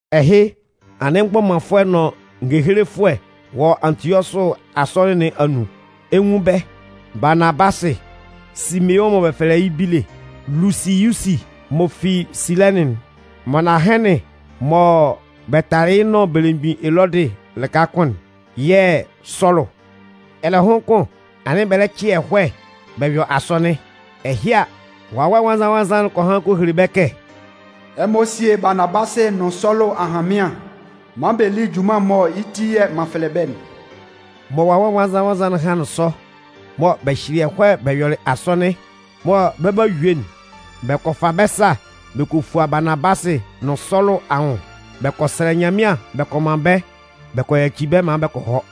Ɛhɩ, anɩn mgbɔmanfʋɛ nʋn ngehelefʋɛ wɔ Antiɔsʋ asɔnɩn nɩn anun. Ɛ 'nwun bɛ́: Baanabasɩ, Simeʋn mɔ bɛ fɛlɛ yɩ́ Bíle, Lusiyusi m'ɔ fi Silɛnɩn'n, Manahɛnɩn mɔ bɛ talɩ yɩ́ nʋn belemgbin Elɔdɩ lɩka kʋn'n yɛ̂ Sɔlʋ. Ɛlɛhʋn kʋn, anɩn bɛ lɛ cɩ ɛhɔɛ bɛ yɔ asɔnɩn. Ɛhɩ a, Wawɛ Nwannzan-nwannzan'n kɔ han kɔ hele bɛ́ kɛ: “Ɛmɔ síe Baanabasɩ nʋn Sɔlʋ ahanmɩan maan bɛ lí junman'n mɔ yɩ́ ti yɛ̂ m'an fɛlɛ bɛ́'n.” Mɔ Wawɛ Nwannzan-nwannzan'n hanlɩn sɔ, mɔ bɛ hyɩlɩ ɛhɔɛ bɛ yɔlɩ asɔnɩn, mɔ bɛ 'ba yue'n, bɛ kɔ fa bɛ́ sa bɛ kɔ fua Baanabasɩ nʋn Sɔlʋ anwʋn, bɛ kɔ sɛlɛ Nyanmɩan bɛ kɔ man bɛ́ bɛ kɔ yaci bɛ́ maan bɛ kɔ hɔ.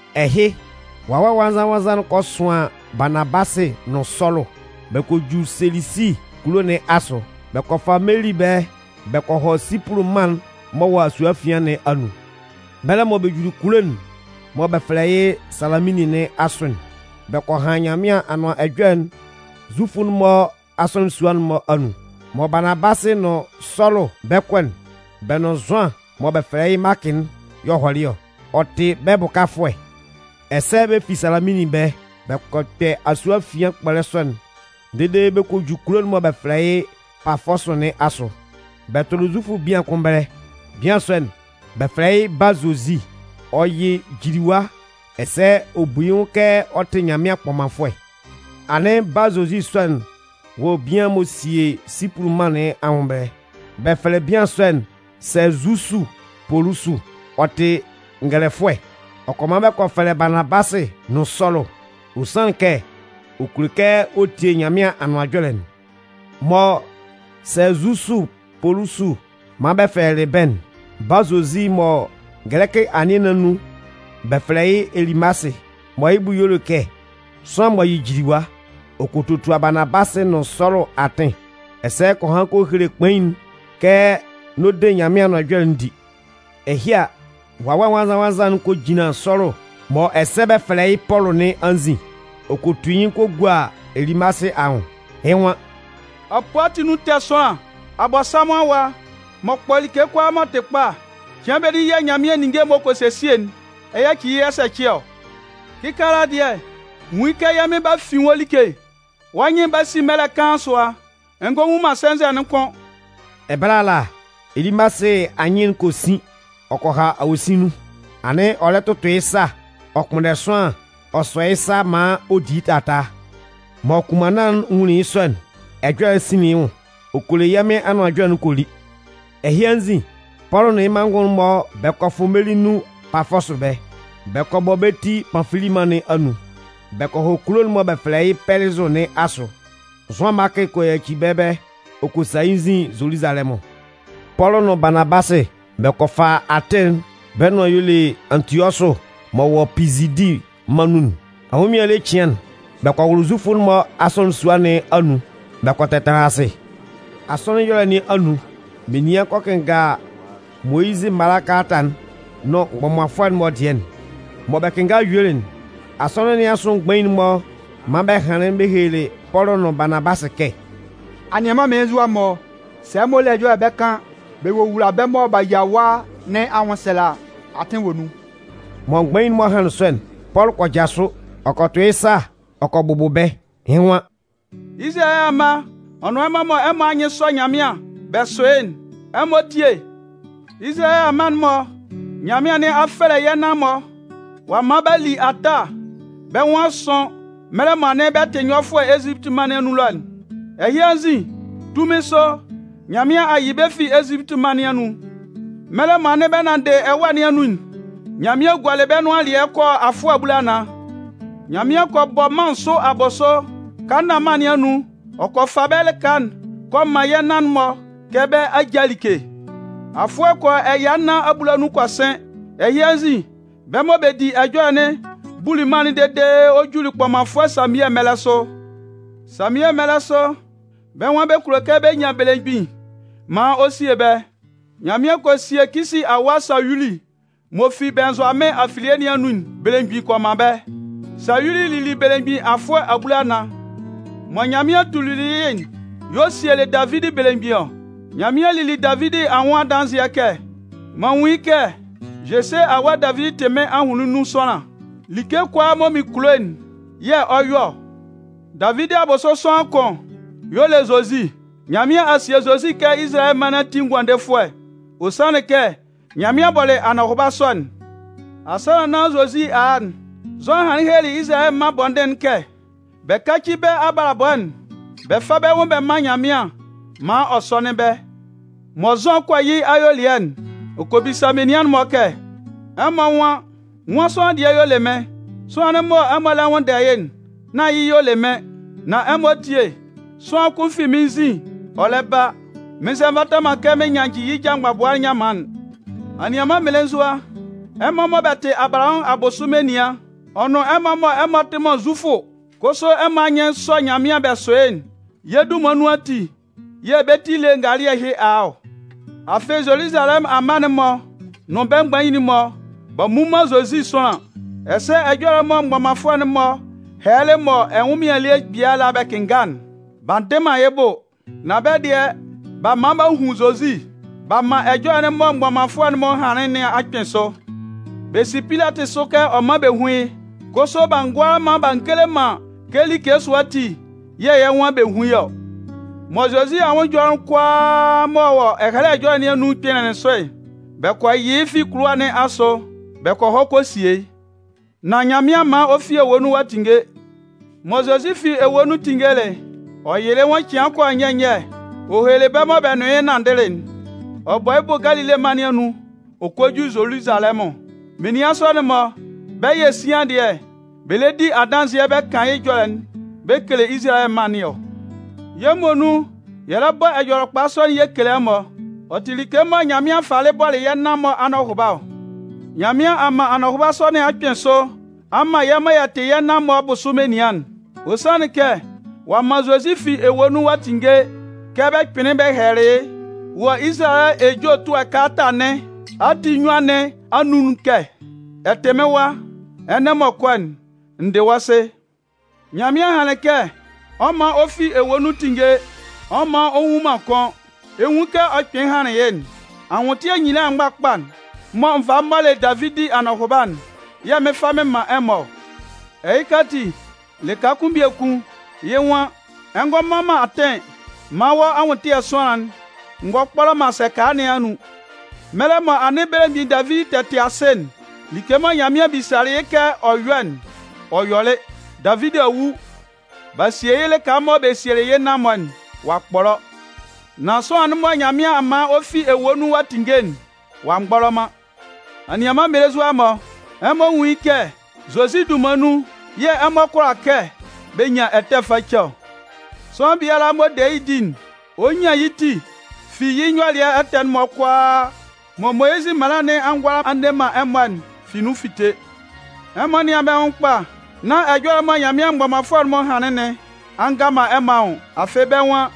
Ɛhɩ, Wawɛ Nwannzan-nwannzan'n kɔ sʋan Baanabasɩ nʋn Sɔlʋ. Bɛ kɔ ju Selesi kulo nɩn asʋ. Bɛ kɔ fa meli ɛbɛlɛ bɛ kɔ hɔ Sipʋlʋ mân'n m'ɔ wɔ asue afian nɩn anun. Mɛlɛ mɔ bɛ juli kulo'n mɔ bɛ fɛlɛ yɩ́ Salaminnin nɩn asʋ'n, bɛ kɔ han Nyanmɩan Anʋan Ɛjɔlɛ'n Zufʋ'n-mɔ asɔnɩn sua'n-mɔ anun. Mɔ Baanabasɩ nʋn Sɔlʋ bɛ 'kɔ'n, bɛ nʋn Zʋan mɔ bɛ fɛlɛ yɩ́ Maakɩ'n y'ɔ hɔlɩ ɔ. Ɔ tɩ bɛ́ bʋkafʋɛ. Ɛsɛ bɛ fi Salaminnin ɛbɛlɛ, bɛ kɔ kpɛ asue afian kpɔlɛ sɔ'n dede bɛ kɔ ju kulo'n mɔ bɛ fɛlɛ yɩ́ Pafɔsʋ nɩn asʋ. Bɛ tʋlɩ Zufʋ bian kʋn ɛbɛlɛ. Bian sɔ'n, bɛ fɛlɛ yɩ́ Bâ-Zozi. Ɔ yɩ jiliwa ɛsɛ ɔ bu yɩ́ nwʋn kɛ ɔ tɩ Nyanmɩan kpɔmanfʋɛ. Anɩn Bâ-Zozi sɔ'n wɔ bian m'ɔ sie Sipʋlʋ mân nɩn anwʋn ɛbɛlɛ. Bɛ fɛlɛ bian sɔ'n Sɛɛzusu Polusu. Ɔ tɩ ngɛlɛfʋɛ. Ɔ kɔ man bɛ kɔ fɛlɛ Baanabasɩ nʋn Sɔlʋ, ɔ sanlɩn kɛ ɔ kulo kɛ ɔ tie Nyanmɩan Anʋan Ɛjɔlɛ'n. Mɔ Sɛɛzusu Polusu man bɛ fɛlɛlɩ bɛ́'n, Bâ-Zozi mɔ gɛlɛkɩ anɩɛ nɩn anun bɛ fɛlɛ yɩ́ Elimasɩ mɔ yɩ́ bʋ y'ɔ le kɛ sʋanlan m'ɔ yɩ jiliwa, ɔ kɔ totua Baanabasɩ nʋn Sɔlʋ atɩn, ɛsɛ ɔ kɔ han kɔ hele kpain'n kɛ n'ɔ de Nyanmɩan Anʋan Ɛjɔlɛ'n di. Ɛhɩ a, Wawɛ Nwannzan-nwannzan'n kɔ jinlan Sɔlʋ mɔ ɛsɛ bɛ fɛlɛ yɩ́ Pɔlʋ nɩn anzin. Ɔ kɔ tu yɩ́ nyɩn kɔ gua Elimasɩ anwʋn. yɩ́ nwan: “Apoo ati anun ɛtɛ sʋanlan, Abɔnsanmʋn awa, m'ɔ kpɔ like kʋalaa m'ɔ tɩ kpa, cɩan benin yɛ̂ Nyanmɩan ninnge m'ɔ kɔ sesie'n ɛ 'yaci yɩ́ ɛsɛcɩ ɔ. Kɩkaala dɩɛ, nwun yɩ́ kɛ yɛ́ Mɩn 'ba fin wɔ́ like. Wɔ́ nyɩn'n 'ba sin mɛlɛ kaan sʋa, ɛ ngɔ nwun man sɛnzɛ'n kʋ́n.” Ɛbɛlɛ ala, Elimasɩ anyɩn'n kɔ sin ɔ kɔ ha awosin nun. Anɩn ɔ lɛ tʋtʋ yɩ́ sa ɔ kpʋnndɛ sʋanlan ɔ sɔ yɩ́ sa maan ɔ di yɩ́ taataa. Mɔ kʋnmanna'n nwunlin yɩ́ sɔ'n, ɛjɔlɛ'n sinlin yɩ́ nwʋn. Ɔ kɔ le yɛ́ Mɩn Anʋan Ɛjɔlɛ'n kɔ li. Ɛhɩ anzin, Pɔlʋ nʋn yɩ́ manngʋn'n-mɔ bɛ kɔ fʋ meli nun Pafɔsʋ ɛbɛlɛ. Bɛ kɔ bɔ bɛ́ ti Panfili mân nɩn anun. Bɛ kɔ hɔ kulo'n mɔ bɛ fɛlɛ yɩ́ Pɛlɩzʋ nɩn asʋ. Zʋan Maakɩ kɔ yaci bɛ́ ɛbɛlɛ ɔ kɔ sa yɩ́ nzin Zoluzalɛmʋn. Pɔlʋ nʋn Baanabasɩ bɛ kɔ fa atɩn'n bɛ́ nʋan y'ɔ le Antiɔsʋ m'ɔ wɔ Pizidi mân nun'n. Ɛnwʋnmɩan ele cɩan'n, bɛ kɔ wʋlʋ Zufʋ'n-mɔ asɔnɩn sua nɩn anun bɛ kɔ tɛtanlan asɩ. Asɔnɩn ɛyɔlɛ nɩn anun, menian kɔ kɩnnga Moyizɩ mala kalata'n nʋn mgbɔmanfʋɛ'n-mɔ dɩɛ'n. Mɔ bɛ kɩnngalɩ yuelɩ'n, asɔnɩn nɩn asʋ mgbain'n-mɔ man bɛ hanlɩn bɛ helelɩ Pɔlʋ nʋn Baanabasɩ kɛ: “Anianman mmelenzua-mɔ, sɛ ɛmɔ le ɛjɔlɛ bɛ kan bɛ wowula bɛ́ mɔ b'a yia ɛwa nɩn anwʋnsɛlɛ a, atɩn wɔ nun.” Mɔ mgbain'n-mɔ hanlɩn sɔ'n, Pɔlʋ kɔ jasʋ, ɔ kɔ tʋ yɩ́ sa ɔ kɔ bʋbʋ bɛ́, yɩ́ nwan: “Izalayɛ amma ɔ nʋn ɛmɔ mɔ ɛmɔ anyɩn sɔ Nyanmɩan bɛ sʋ yɩ́'n, ɛmɔ tíe. Izalayɛ amma'n-mɔ Nyanmɩan nɩn a fɛlɛ yɛ́ nan-mɔ. Ɔ a man b'a li ata bɛ́ nwʋn a sʋn mɛlɛ mɔ anɩn bɛ tɩ nyɔfʋɛ Ezipiti mân nɩn anun ɛlɔ'n. Ɛhɩ anzin, tunmin sʋ, Nyanmɩan a yɩ bɛ́ fi Ezipiti mân nɩn anun. Mɛlɛ mɔ anɩn bɛ nanndɩ ɛwâ nɩn anun'n, Nyanmɩan gualɩ bɛ́ nʋan alɩɛ kɔ yɔ afʋɛ abulanan. Nyanmɩan kɔ bɔ mân nsʋ abʋsʋ Kanaân mân nɩn anun ɔ kɔ fa bɛ́ lɩka'n kɔ man yɛ́ nan-mɔ kɛ bɛ́ ajâ like. Afʋɛ kɔ yɔ ɛya nnan abulanun kɔ sɩn. “Ɛhɩ anzin, bɛ́ mɔ bɛ di ɛjɔlɛ'n buli mân'n dede ɔ juli kpɔmanfʋɛ Samiɛ mɛlɛ sʋ. Samiɛ mɛlɛ sʋ, bɛ́ nwan bɛ kulo kɛ bɛ nyan belemgbin maan ɔ sie bɛ́. Nyanmɩan kɔ sie Kisi awa Sayuli m'ɔ fi Bɩnnzʋamɩn afilie nɩn anun'n belemgbin kɔ man bɛ́. Sayuli lili belemgbin afʋɛ abulanan. Mɔ Nyanmɩan tuli yɩ́'n y'ɔ sielɩ Davidi belemgbin ɔ. Nyanmɩan lili Davidi anwʋn adanzɩɛ kɛ: M'an nwun yɩ́ kɛ Jese awa Davidi tɩ mɩ́n ahʋnlɩn nun sʋanlan. Like kʋalaa mɔ mɩn kulo'n yɛ̂ ɔ 'yɔ ɔ. “Davidi abʋsʋ sʋanlan kʋn y'ɔ le Zozi. Nyanmɩan a sie Zozi kɛ Izalayɛ mân nɩn ati Ngʋandefʋɛ. Ɔ sanlɩn kɛ Nyanmɩan bɔlɩ anɔhʋba sɔ'n. Asannan nán Zozi a a'n, Zʋan hanlɩn helelɩ Izalayɛ mân bɔndɩn'n kɛ bɛ káci bɛ́ abalabɔ'n bɛ fá bɛ́ nwʋn bɛ mán Nyanmɩan maan ɔ sɔ́nɩn bɛ́. Mɔ Zʋan 'kɔ yɩ́ ayuelɩɛ'n, ɔ kɔ bisa menian'n-mɔ kɛ: ‘Ɛmɔ nwan: nwan sʋanlan dɩɛ y'ɔ le mɩ́n? Sʋanlan'n mɔ ɛmɔ lɛ nwʋnndɛ yɩ́'n, nán yɩ́ y'ɔ le mɩ́n! Nan ɛmɔ tíe, sʋanlan kʋn fi mɩ́n nzin ɔ lɛ ba, mɩn nzɛ nvata man kɛ mɩn nyannjɩ yɩ́ ja mgbabʋa nyanman'n.’ “Anianman mmelenzua, ɛmɔ mɔ bɛ tɩ Abalahamʋn abʋsʋ menian, ɔ nʋn ɛmɔ mɔ ɛmɔ tɩ man Zufʋ kʋsʋ ɛmɔ anyɩn sɔ Nyanmɩan bɛ sʋ yɩ́'n, yɛ́ dunman nun ati yɛ̂ bɛ́ ti ele ngalɩɛ ɛhɩ a a ɔ. Afɩ, Zoluzalɛmʋn amma'n-mɔ nʋn bɛ́ mgbain'n-mɔ, b'a mmu man Zozi sʋanlan. Ɛsɛ ɛjɔlɛ mɔ mgbɔmanfʋɛ'n-mɔ hɛlɛlɩ mɔ ɛnwʋnmɩan ele biala bɛ kɩnnga'n, b'a ndɩ man yɩ́ bʋ. Nan bɛ́ dɩɛ, b'a man b'a hun Zozi. B'a man ɛjɔlɛ'n mɔ mgbɔmanfʋɛ'n-mɔ hanlɩn nɩn a kpɩn sʋ. Bɛ si Pilatɩ sʋ kɛ ɔ mán bɛ hún yɩ́. Kʋsʋ b'a ngʋala b'a ngele man kɛ like sʋa ati yɛ̂ yɛ́ nwan bɛ́ hún yɩ́ ɔ. Mɔ Zozi anwʋn ɛjɔlɛ'n kʋalaa m'ɔ wɔ Ɛhɛlɛ Ɛjɔlɛ nɩn anun'n kpɩnlɩn sʋ'n, bɛ kɔ yɩ yɩ́ fi kʋlʋwa nɩn asʋ bɛ kɔ hɔ kɔ sie yɩ́. Nan Nyanmɩan man ɔ fi ewue nun ɔ'a tinnge. Mɔ Zozi fi ewue nun tinngelɩ'n, ɔ yɩlɩ yɩ́ nwʋn cɩan kɔ yɔ nyɛ nyɛ ɔ helelɩ bɛ́ mɔ bɛ nʋn yɩ́ nanndɩlɩ'n, ɔ bɔ yɩ́ bʋ Galile mân nɩn anun ɔ kɔ ju Zoluzalɛmʋn. Menian sɔ'n-mɔ, bɛ́ yɛ̂ sian dɩɛ, bɛ lɛ di adanzɩɛ bɛ kan yɩ́ ɛjɔlɛ'n bɛ kele Izalayɛ mân nɩn ɔ. “Yɛ́ muonun yɛ lɛ bɔ Ɛjɔlɛkpa sɔ'n yɛ kele ɛmɔ. Ɔ tɩ like mɔ Nyanmɩan falɩ bɔlɩ yɛ́ nan-mɔ anɔhʋba ɔ. Nyanmɩan a man anɔhʋba sɔ nɩn a kpɩn sʋ a man yɛ́ mɔ yɛ tɩ yɛ́ nan-mɔ abʋsʋ menian'n. Ɔ sanlɩn kɛ, ɔ'a man Zozi fi ewue nun a tinnge kɛ bɛ kpɩnlɩn bɛ hɛlɛlɩ yɩ́ wɔ Izalayɛ ejue ɛtʋɛ kalata nɩn ati nnyuan nɩn anun'n kɛ: Ɛ tɩ mɩ́n Wa, ɛnɛ m'ɔ kɔ'n, n dɩ wɔ́ Sɩ. “Nyanmɩan hanlɩn kɛ ɔ 'man ɔ fi ewue nun tinnge, ɔ 'man ɔ nwu man kʋ́n. Ɛ 'nwun kɛ ɔ kpɩnlɩn hanlɩn yɩ́'n: Anwʋntɩɛ nyila mgbakpa'n mɔ n valɩ m mɔlɩ Davidi anɔhʋba'n yɛ̂ mɩn 'fa mɩn man ɛmɔ ɔ. Ɛhɩka ati, lɩka kʋn biekun yɩ́ nwan: Ɛ ngɔ man man atɩn maan wɔ́ anwʋntɩɛ sʋanlan'n ngɔ kpɔlɔ man sɛka nɩn anun. “Mɛlɛ mɔ anɩn belemgbin Davidi tɛ tɩ asɩ'n, like mɔ Nyanmɩan bisalɩ yɩ́ kɛ ɔ yɔ́'n, ɔ yɔlɩ. Davidi a wu, b'a sie yɩ́ lɩka mɔ bɛ sielɩ yɩ́ nan-mɔ'n, ɔ'a kpɔlɔ. Nan sʋanlan'n mɔ Nyanmɩan a man ɔ fi ewue nun ɔ a tinnge'n, ɔ'a mgbɔlɔ man. “Anianman mmelenzua-mɔ, ɛmɔ nwún yɩ́ kɛ Zozi dunman nun yɛ̂ ɛmɔ kʋala kɛ bɛ nyan ɛtɛ face ɔ. Sʋanlan biala m'ɔ de yɩ́ di'n, ɔ nyan yɩ́ ti fi yɩ́ nyɔlɩɛ ɛtɛ'n-mɔ kʋalaa mɔ Moyizɩ mala nɩn a ngʋala a nne man ɛmɔ'n fi nun fite. Ɛmɔ nɩ́an bɛ́ nwʋn kpa, nán ɛjɔlɛ'n mɔ Nyanmɩan mgbɔmanfʋɛ'n-mɔ hanlɩn nɩn a nga man ɛmɔ anwʋn. Afɩ, bɛ́ nwan: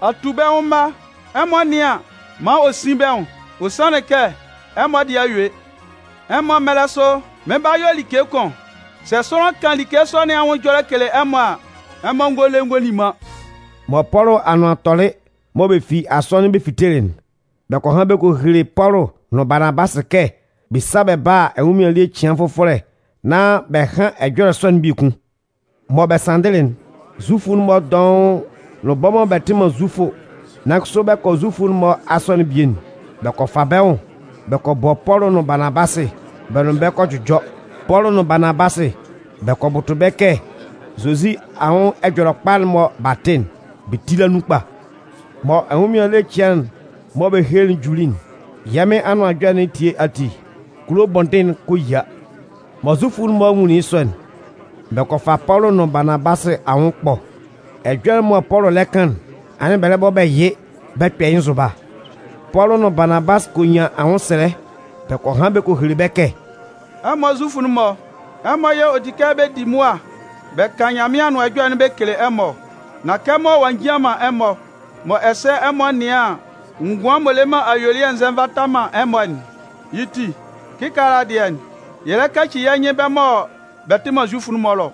Atubɛnwʋn mma, ɛmɔ nɩ́an maan ɔ sín bɛ́ nwʋn, ɔ sanlɩn kɛ ɛmɔ dɩɛ a yue. Ɛmɔ mɛlɛ sʋ, mɩn 'ba yɔ like kʋn. Sɛ sʋanlan kan like sɔ nɩn anwʋn ɛjɔlɛ kele ɛmɔ a, ɛmɔ ngɔ le ngɔ li man.” Mɔ Pɔlʋ anʋan tɔlɩ mɔ bɛ fi asɔnɩn bɛ fitelɩ'n, bɛ kɔ han bɛ kɔ hele Pɔlʋ nʋn Baanabasɩ kɛ bɛ sá bɛ bála ɛnwʋnmɩan ele cɩan fʋfɔlɛ nán bɛ hán ɛjɔlɛ sɔ'n biekun. Mɔ bɛ sanndɩlɩ'n, Zufʋ'n-mɔ dɔʋn nʋn bɛ́ mɔ bɛ tɩ man Zufʋ nan kʋsʋ bɛ kɔ Zufʋ'n-mɔ asɔnɩn'n bie'n, bɛ kɔ fa bɛ́ nwʋn bɛ kɔ bɔ Pɔlʋ nʋn Baanabasɩ bɛ́ nʋn bɛ kɔ jʋjɔ. Pɔlʋ nʋn Baanabasɩ bɛ kɔ bʋtʋ bɛ́ kɛ Zozi anwʋn Ɛjɔlɛkpa'n mɔ b'a tɩ'n, bɛ tíla nun kpa. Mɔ ɛnwʋnmɩan ele cɩan'n mɔ bɛ helelɩ'n juli'n, yɛ́ Mɩn Anʋan Ɛjɔlɛ nɩn etie ati, kulo bɔndɩn'n kɔ yia. Mɔ Zufʋ'n-mɔ nwunlin yɩ́ sɔ'n, bɛ kɔ fa Pɔlʋ nʋn Baanabasɩ anwʋn ɛkpɔ. Ɛjɔlɛ'n mɔ Pɔlʋ lɛ kan'n, anɩn bɛ lɛ bɔ bɛ yɩ bɛ kpɛ yɩ́ nzʋba. Pɔlʋ nʋn Baanabasɩ kɔ nyan anwʋnsɛlɛ bɛ kɔ han bɛ kɔ hele bɛ́ kɛ: “Ɛmɔ Zufʋ'n-mɔ, ɛmɔ yɛ̂ ɔ di kɛ bɛ di mʋa bɛ kan Nyanmɩan Anʋan Ɛjɔlɛ'n bɛ kele ɛmɔ ɔ. Nan kɛmɔ ɔ njian man ɛmɔ, mɔ ɛsɛ ɛmɔ nɩan an, ngʋan m'ɔ le man ayuelɩɛ'n nzɛ nvata man ɛmɔ'n, yɩ́ ti, kɩkaala dɩɛ, yɛ lɛ kaci yɛ́ nyɩn bɛ́ mɔ bɛ tɩ man Zufʋ'n-mɔ ɛlɔ.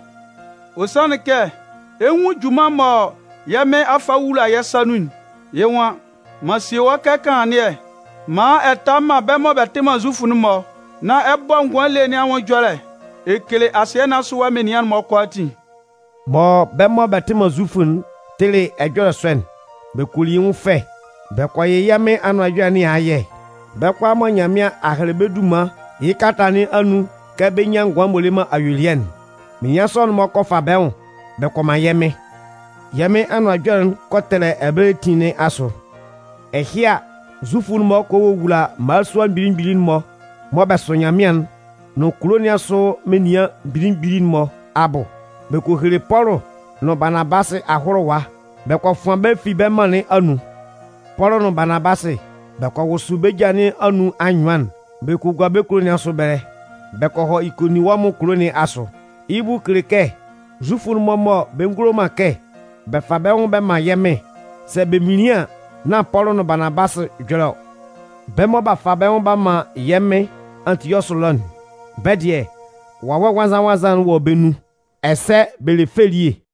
Ɔ sanlɩn kɛ, ɛ 'nwun junman'n mɔ yɛ́ Mɩn a fa a wula yɛ́ sa nun'n, yɩ́ nwan: M'an sie wɔ́ kɛ kanlannɩɛ maan ɛ ta man bɛ́ mɔ bɛ tɩ man Zufʋ'n-mɔ nán ɛ bɔ ngʋan ele nɩn anwʋn ɛjɔlɛ ɛ kele asɩɛ nɩn asʋ menian'n-mɔ kʋalaatin.” Mɔ bɛ́ mɔ bɛ tɩ man Zufʋ'n tɩlɩ ɛjɔlɛ sɔ'n, bɛ kɔ li yɩ́ nwʋn fɛ, bɛ kɔ yɩ yɛ́ Mɩn Anʋan Ɛjɔlɛ nɩn ayɛ. Bɛ́ kʋalaa mɔ Nyanmɩan a hɛlɛ bɛ́ dunman yɩ́ kalata nɩn anun kɛ bɛ nyán ngʋan m'ɔ le man ayuelɩɛ'n, menian sɔ'n-mɔ kɔ fa bɛ́ nwʋn bɛ kɔ man yɛ́ Mɩn. Yɛ́ Mɩn Anʋan Ɛjɔlɛ'n kɔ tɛlɛ ɛbɛlɛ etin nɩn asʋ. Ɛhɩ a, Zufʋ'n-mɔ kɔ wowula mmalasua mgbili mgbili'n-mɔ mɔ bɛ sʋ Nyanmɩan'n nʋn kulo nɩn asʋ menian mgbili mgbili'n-mɔ abʋ. Bɛ kɔ hele Pɔlʋ nʋn Baanabasɩ ahʋlʋwa bɛ kɔ fʋan bɛ́ fi bɛ́ mân nɩn anun. Pɔlʋ nʋn Baanabasɩ bɛ kɔ wʋsʋ bɛ́ ja nɩn anun anyʋan'n bɛ kɔ gua bɛ́ kulo nɩn asʋ ɛbɛlɛ bɛ kɔ hɔ Ikoninwɔmʋn kulo nɩn asʋ. (Yɩ́ bʋ kele kɛ Zufʋ'n-mɔ mɔ bɛ ngulo man kɛ bɛ fa bɛ́ nwʋn bɛ man yɛ́ Mɩn'n, sɛ bɛ minlin an, nán Pɔlʋ nʋn Baanabasɩ ɛjɔlɛ ɔ.) Bɛ́ mɔ b'a fa bɛ́ nwʋn b'a man yɛ́ Mɩn Antiɔsʋ ɛlɔ'n, bɛ́ dɩɛ, Wawɛ Nwannzan-nwannzan'n wɔ bɛ́ nun, ɛsɛ bɛ le fɛ elie.